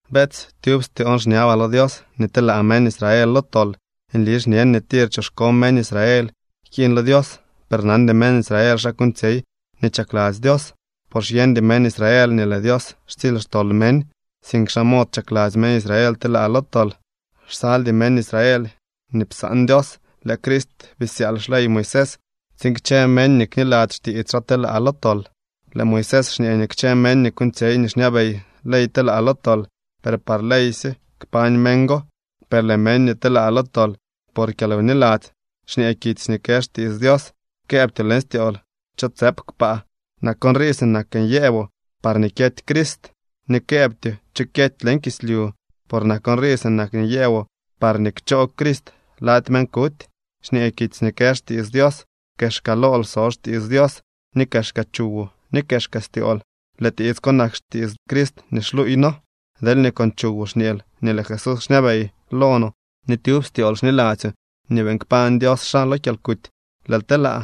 Beetsy, tyub styoon xñabaa lo Dios nii telaa meñ Israel lo tol. Nli xñen nii tir choxko meñ Israel jkiiñ lo Dios, per nandy meñ Israel xa kuuñtsyey nii chakladzy Dios. Por xyeñdy meñ Israel nii lëë Dios xtsily xtol meñ, sink xaa mod chakladzy meñ Israel telaa lo tol. Xsaldy meñ Israel nii psaan Dios. Lëë Crist bisyaal xley Moisés tsiin kchë meñ nii kniladzy xtiits xaa telaa lo tol. Lëë Moisés xñee nii kchë meñ nii kuuñtsyey nii xñabey ley telaa lo tol. Per par ley sye kpañ meñ go. Per lëë meñ nii telaa lo tol por kyalwniladzy, xñee kitsy nii kë xtiits Dios: “Këëbtyoo leñ styool: ¿Cho tsëp kpaa? (Nak nrii sinak nii nyëboo parñee kyety Crist.) Ni këëbtyoo: ¿Cho kyety leñ kislyu?” (Por nak nrii sinak nii nyëboo parñee kchoo Crist lady meñ kuty.) Xñee kitsy nii kë xtiits Dios: “Kexka lool so xtiits Dios, ni kexka chuwoo, ni kexka styool.” Lëë tiits ko nak xtiits Crist nii xluuy noo. Deelñee con chuwoo xñeel nii lëë Jesús xñabey lo no, ni tyub styool xniladzyoo nii beeñ kpañ Dios xaa lo kyalkuty, lëël telaa.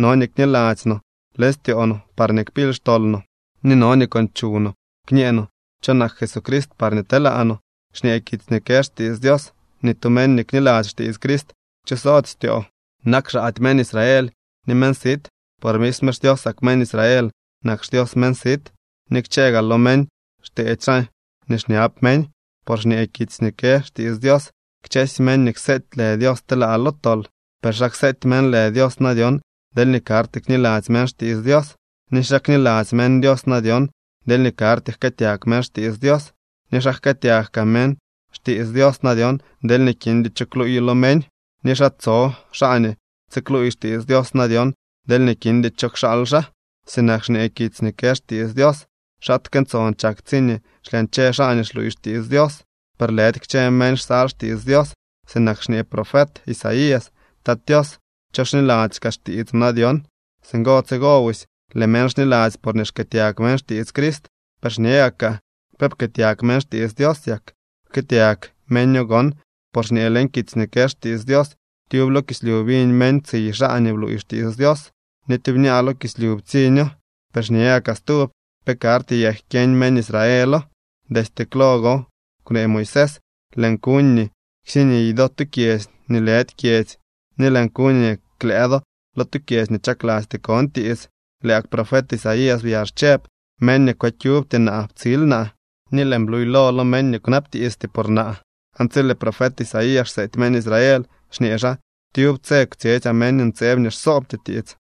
No nii kniladzy no leñ styoo no parñee kpily xtol no, ni no nii con chuw no kñee no cho nak Jesucrist parñee telaa no. Xñee kitsy nii kë xtiits Dios: “Ni tu meñ nii kniladzy xtiits Crist kchosody styoo.” Nak xaady meñ Israel ni meñ sit. Por misme xDiosak meñ Israel nak xDios meñ sit, ni kchë gaa lo meñ xteedy xaa nii xñab meñ. Por xñee kitsy nii kë xtiits Dios: “Kchësy meñ nii kseety lë Dios telaa lo tol.” ¿Per xa kseety meñ lë Dios na dyon, deelñee karty kniladzy meñ xtiits Dios? ¿Ni xa kniladzy meñ Dios na dyon, deelñee karty jkëëtyag meñ xtiits Dios? ¿Ni xa jkëëtyag kaa meñ xtiits Dios na dyon, deelñee kindy cho kluuyo lo meñ? ¿Ni xa tso xaa nii tsikluuy xtiits Dios na dyon, deelñee kindy cho kxaal xaa? Sinak xñee kitsy nii kë xtiits Dios: “¡Xaatke ntson chak tsiñee xlyañche xaa nii xluuy xtiits Dios!” Per lëdy kchë meñ xsal xtiits Dios. Sinak xñee profet Isaías: “Tat Tios, ¿cho xniladzy kaa xtiits no na dyon?” Singo tsigo busy, lëë meñ xniladzy porñee xkëëtyag meñ xtiits Crist. Per xñe gakaa: ¿Pe pkëëtyag meñ xtiits Dios yak? ¡Pkëëtyag meño gon! Por xñee leñ kitsy nii kë xtiits Dios: Tyub lo kislyu biñ meñ tsiy xaa nii bluuy xtiits Dios, ni tyubñaa lo kislyu ptsiño. Per xñe gakaa stub: ¿Pe karty yak kyeñ meñ Israelo? Destye klo gon kwnee Moisés: Lëën kuñ nii ksiniy do tu kyedzy nii lëdy kyedzy, ni lëën kuñ nii klëë do lo tu kyedzy nii chaklasty kon tiits. Lëë gak profet Isaías byax chëb: Meñ nii kwëkyubty naa ptsil naa, ni lëën bluylo lo meñ nii kwnabtiisty por naa. Aan tsi lëë profet Isaías xseety meñ Israel, xñee xaa: “Tyub tse kwtsyetsyaa meñ ntseeb nii xsoobty tiits.”